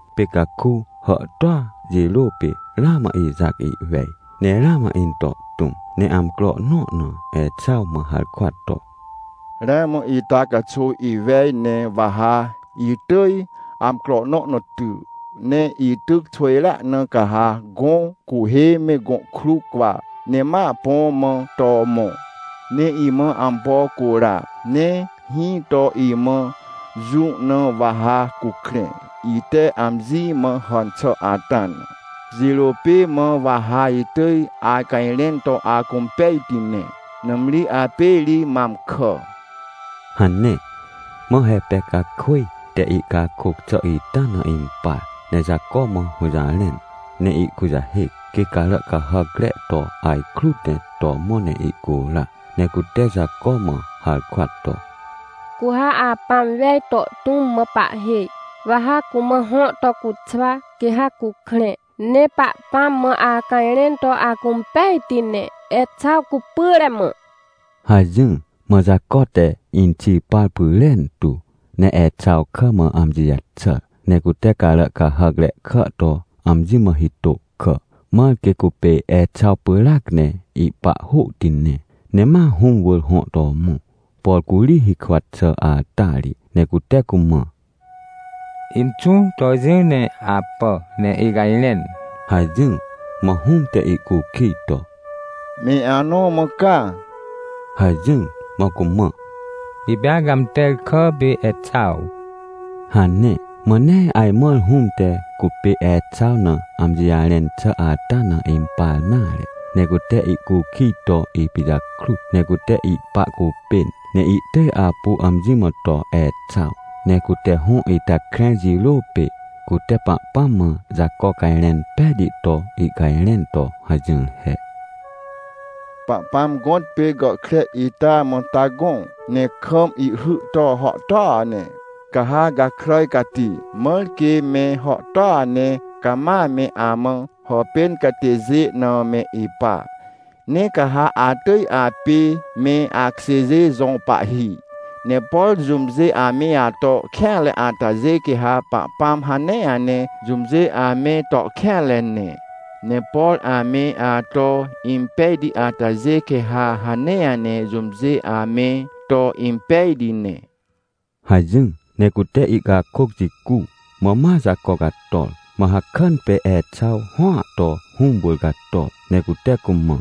Pê caku hàhtôa jirô pê ramã Ixac ihwej, ne ramã into tũm. Ne amcro nõ na Exaw mã harkwa to: — Ramã ita caxuw iwej, ne wa ha itỳj amcro nõ na ty. Ne ityc xwỳjrea na, ca ha gõ cuhê me gõ kruw cwa, ne ma põ mã to mõ, ne imã ampo cura, ne hĩ to imã jũ na wa ha cukrẽ, ite amji mã hàn xà ata na. Jirô pê mã wa ha itỳj acajrẽn to acũmpejti ne. Nãmri apê ri mam kà — hane. Mã Repecakwỳj te ihcakôc xà ita na impar, ne Jaco mã hũjarẽn, ne ihkujahêc, quê carà cahàcre to ajkrut ne to mõ ne ihcura. Ne cute Jaco mã harkwa to: — Cu ha apãm wej to tũm mã pahhêj. Wa ha cumã hõ to cuxwa, quê ha cukrẽ, ne Pahpãm mã acajrẽn to acũmpejti ne, Exaw cupyre mã — hajỹr. Mã Jaco te inxi par pyrentu, ne Exaw kà mã amji jaxàr, ne cute carà cahàcre kà to amji mã hitô kà, mãr quê cupê Exaw pyràac ne ihpa hôhti ne. Ne ma hũm wỳr hõ to mõ, por curi hikwa xà ata ri, ne cute cumã: — Inxũ, to jỹ ne apà, ne icajrẽn — hajỹr. Mã hũm te ihcukij to: — Me anõ mã ca? — hajỹr. Mã cumã: — Ipê acãmter kà pê Exaw — hane. Mã nee ajmãr hũm te cupê Exaw na amji jarẽn xà ata na impar nare. Ne cute ihcukij to ipijakrut. Ne cute ihpa cupên ne ihtỳj apu amji mã to Exaw. Ne cute hõ ita krẽr jirô pê, cute Pahpãm mã Jaco cajrẽn pejti to ihcajrẽn to hajỹr he: — Pahpãm gõtpê gàhkre ita mã ta gõ, ne kam ihhy to hàhtôa ne. Ca ha gakràj cati mãr quê me hàhtôa ne cama me amã hàpên catêjê na me ipa. Ne ca ha atỳj apê me akjêjê jõ pahhi. Ne por jũmjê ame ato kêanre atajê, quê ha Pahpãm hanea ne jũmjê ame to kêanre ne. Ne por ame ato impejti atajê, quê ha hanea ne jũmjê ame to impejti ne — hajỹr. Ne cute ihcakôc jicu, mã ma Jaco cator. Mã hakàn pê Exaw hõa to hũm wỳr cator, ne cute cumã: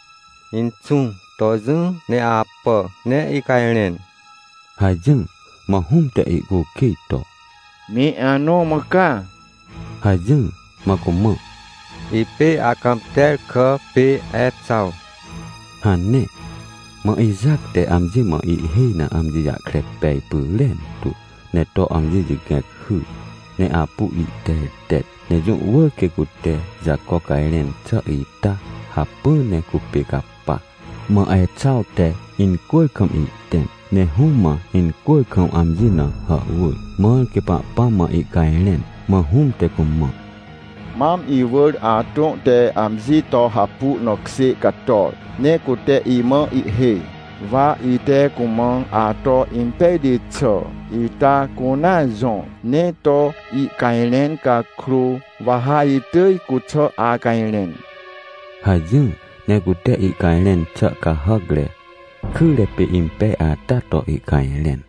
— Inxũ, to jỹ ne apà, ne icajrẽn — hajỹr. Mã hũm te ihcukij to: — Me anõ mã ca? — hajỹr. Mã cumã: — Ipê acãmter kà pê Exaw — hane. Mã Ixac te amji mã ihhêj na amji jahkre pej pyrentu, ne to amji jigẽc hyr, ne apu ihtertet. Ne jũ wỳr quê cute Jaco cajrẽn xà ita hacpỹ ne cupê capa. Mã Exaw te incwỳr kam ihtẽm, ne hũm mã incwỳr kam amji na hàhwỳr, mãr quê Pahpãm mã ihcajrẽn. Mã hũm te cumã: — Mam iwỳr atõ te amji to hapu na kjê cator, ne cute imã ihhêj, wa ite cumã ato impejti xà ita cunea jõr ne to ihcajrẽn cakrô, wa ha itỳj cuxà acajrẽn — hajỹr. Ne cute ihcajrẽn xà cahàcre, kyre pê impej ata to ihcajrẽn.